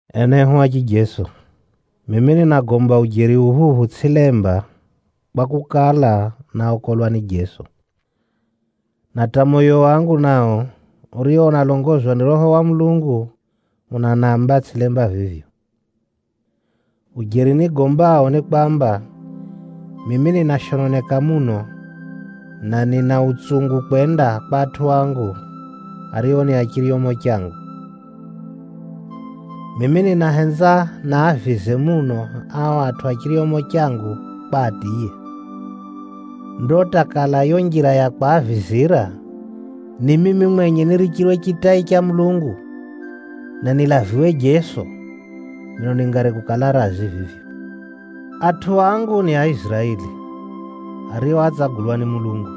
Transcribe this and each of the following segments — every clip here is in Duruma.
Enehu a chijeso, mimi ninagomba ujeri uphuphu tsʼilemba, kwakukala, náokolwa ni Kʼirisito. Na hata moyo wangu nao urio unalongozwa ni Roho wa Mulungu, unanamba tsʼilemba vivyo. Ujeri nigombao ni kwamba, mimi ninashononeka muno, na nina utsungu kwenda kwa atʼu angu, ario ni a chiryomo changu. Mimi ninahenza navize muno ao atʼu a chiryomo changu kwa atiye. Ndo hata kala yo njira ya kwaavizira, ni mimi mwenye nirichirwe chitai cha Mulungu, na nilaviwe Kʼirisito, mino ningari kukala razi vivyo. Atʼu angu ni Aiziraeli, ario átsagulwa ni Mulungu.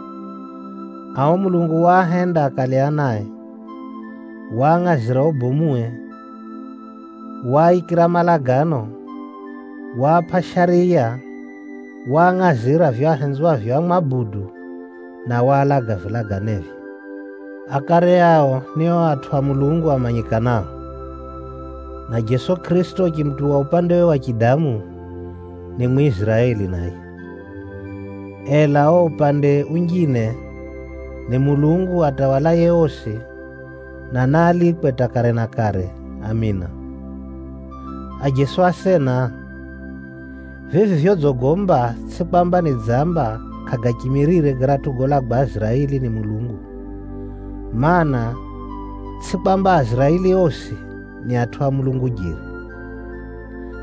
Ao Mulungu waahenda akale anae, waangʼazira ubomuwe, waaikira malagano, waapʼa Shariya, waangʼazira vivyo ahenzwavyo amwabudu, na waalaga vilaganevye. Akare ao ni o atʼu a Mulungu amanyikanao, na Jeso Kʼirisito uchimutuwa upandewe wa chidamu, ni Mwiziraeli naye. Ela o upande unjine, ni Mulungu atawalaye osi, na naalikwe hata kare na kare! Amina. Ajeso asena, vivi vyodzigomba tsʼi kwamba neno ra Mulungu kʼarichimizire garatʼu golagwa Aiziraeli ni Mulungu, mana, tsʼi kwamba Aiziraeli osi ni atʼu a Mulungu jeri.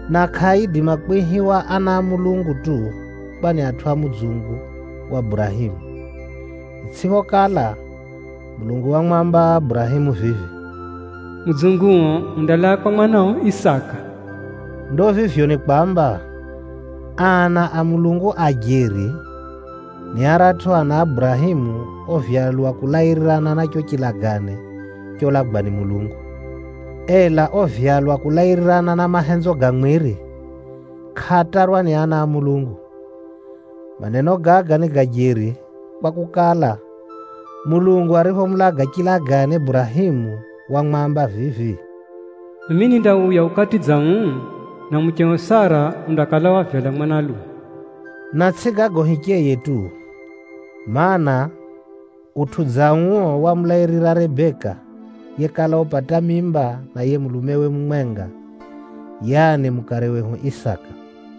Na kʼaaidima kwihiwa ana a Mulungu tu kwa ni atʼu a mudzungu wa Burahemu. Itsʼiphokala, Mulungu wamwamba Burahemu vivi, “Atʼu a mudzunguo andalaa kwa mwanao Isaka.” Ndo vivyo ni kwamba, ana a Mulungu a jeri, ni aratʼu ana a Burahemu ovyalwa kulairirana na cho chilagane cholagwa ni Mulungu. Ela ovyalwa kulairirana na mahenzo ga mwiri, kʼaatarwa ni ana a Mulungu. Maneno gaga ni ga jeri, kwakukala, Mulungu ariphomuulaga chilagane Burahemu, wamwamba vivi, “Mimi nindauya ukati dza uu, na mucheo Sara undakala wavyala mwanalume.” Na tsʼi gago hicheye tu, mana, utʼu dza uo wamulairira Rebeka yekala upata mimba na yiye mulumewe mumwenga, yaani mukare wehu Isaka.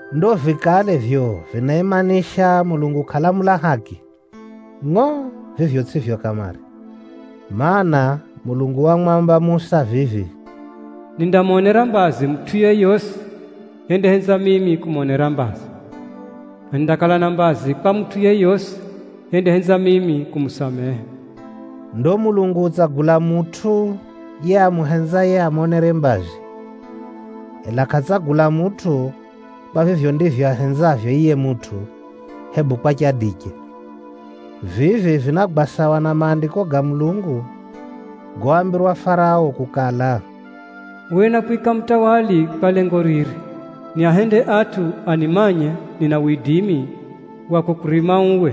Ndo vikale vivyo vinaimanisha Mulungu kʼalamula haki? Ngʼo! Vivyo tsʼivyo kamare. Maana, Mulungu wamwamba Musa vivi, “Nindamonera mbazi mutʼu yeyosi nihenzaye kumonera mbazi, na nindamwajaliya yeyosi nihenzaye kumwajaliya.” Ndo Mulungu utsagula mutʼu yiye amuhenzaye amonere mbazi, ela kʼatsagula mutʼu kwa vivyo ndivyo ahenzavyo yiye mutʼu, hebu kwa chadiche. Vivi vinagwa sawa na Maandiko ga Mulungu goambirwa Farao kukala, “Uwe nákwika mutawali kwa lengo riri: nikonyese widimi wangu, na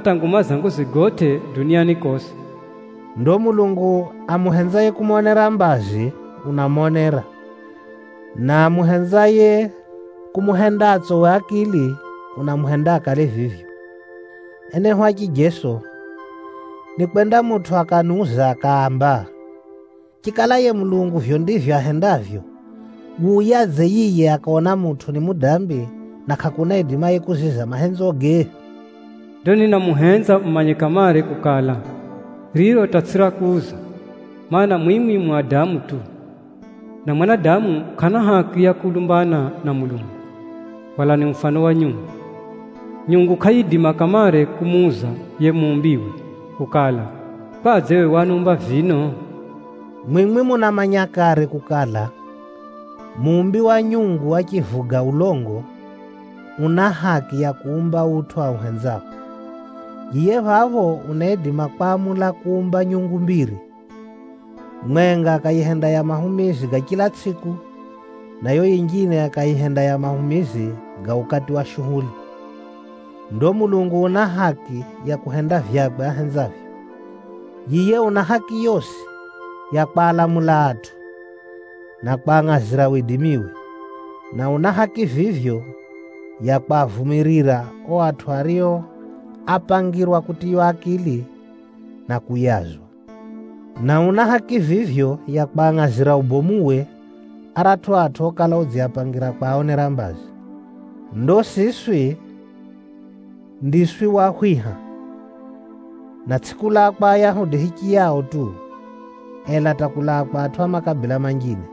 chisha nguma yangu yigotʼe duniani kosi.” Ndo Mulungu amuhenzaye kumonera mbazi, unamonera. Na amuhenzaye kumuhenda atsowe akili, unamuhenda akale vivyo. Enehu a chijeso, nikwenda mutʼu akaniuza akaamba, “Chikala yiye Mulungu vivyo ndivyo ahendavyo, wuyadze yiye akaona mutʼu ni mudambi, na kʼakuna aidimaye kuziza mahenzoge?” Ndo ninamuhenza mumanye kamare kukala, riro hata tsʼi ra kuuza. Maana, mwimwi mu adamu tu, na mwanadamu, kʼana haki ya kulumbana na Mulungu. Hwalani mufano wa nyungu. Nyungu kʼayiidima kamare kumuuza yiye muumbiwe kukala, “Kwadze we waniumba vino?” Mwimwi munamanya kare kukala, muumbi wa nyungu achivuga ulongo, una haki ya kuumba utʼu auhenzao. Yiye phapho unaidima kwamula kuumba nyungu mbiri, mwenga akayihenda ya mahumizi ga chila tsʼiku, na yo yinjine akayihenda ya mahumizi ga ukati wa shuhuli. Ndo Mulungu una haki ya kuhenda vyakwe ahenzavyo. Yiye una haki yosi ya kwalamula atʼu, na kwangʼazira widimiwe. Na una haki vivyo ya kwavumirira o atʼu ario ápangirwa kutiywa akili, na kuyazwa. Na una haki vivyo ya kwangʼazira ubomuwe aratʼu atʼu okala udziapangira kwaonera mbazi. Ndo siswi ndiswi wahwiha, na tsʼi kulaa kwa Ayahudi hichiyao tu, ela hata kulaa kwa atʼu a makabila manjine.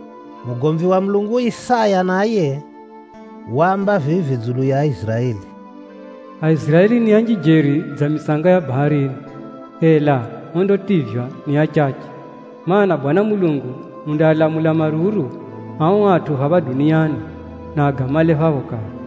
Mugomvi wa Mulungu Isaya naye, waamba vivi dzulu ya Aiziraeli, “Aiziraeli ni anji jeri dza mitsanga ya pwʼani, ela ondativywa ni achache. Maana, Mwenyezi Mulungu undaalamula maruru ao atʼu phapha duniani, na agamale phapho kare.”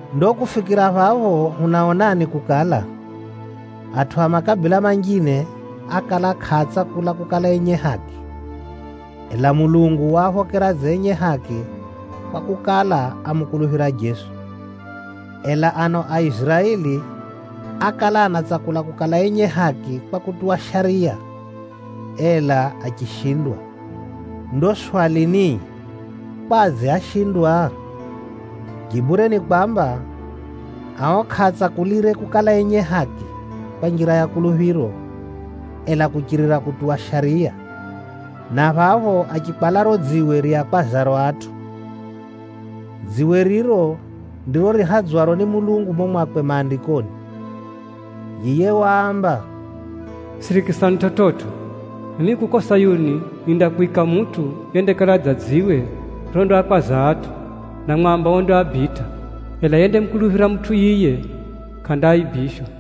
Ndo kufikira phapho hunaonani kukala, atʼu a makabila manjine ákala kʼaatsakula kukala enye haki, ela Mulungu waaphokera dza enye haki kwakukala, ámukuluphira Jeso. Ela ano Aiziraeli ákala anatsakula kukala enye haki kwa kutuwa Shariya, ela achishindwa. Ndo swali ni, kwadze áshindwa? Jibure ni kwamba, ao kʼaatsakulire kukala enye haki kwa njira ya kuluphiro, ela kuchirira kutuwa Shariya, na phapho achikwala riro dziwe riakwazaro atʼu. Dziwe riro ndiro rihadzwaro ni Mulungu mumo mwakwe Maandikoni. Yiye waamba, “Sirikisani chividzo, mimi kuko Sayuni nindakwika mutʼu yendakala dza dziwe rondaakwaza atʼu, na mwamba ondaabitʼa. Ela yendamukuluphira mutʼu yiye, kʼandaifyika.”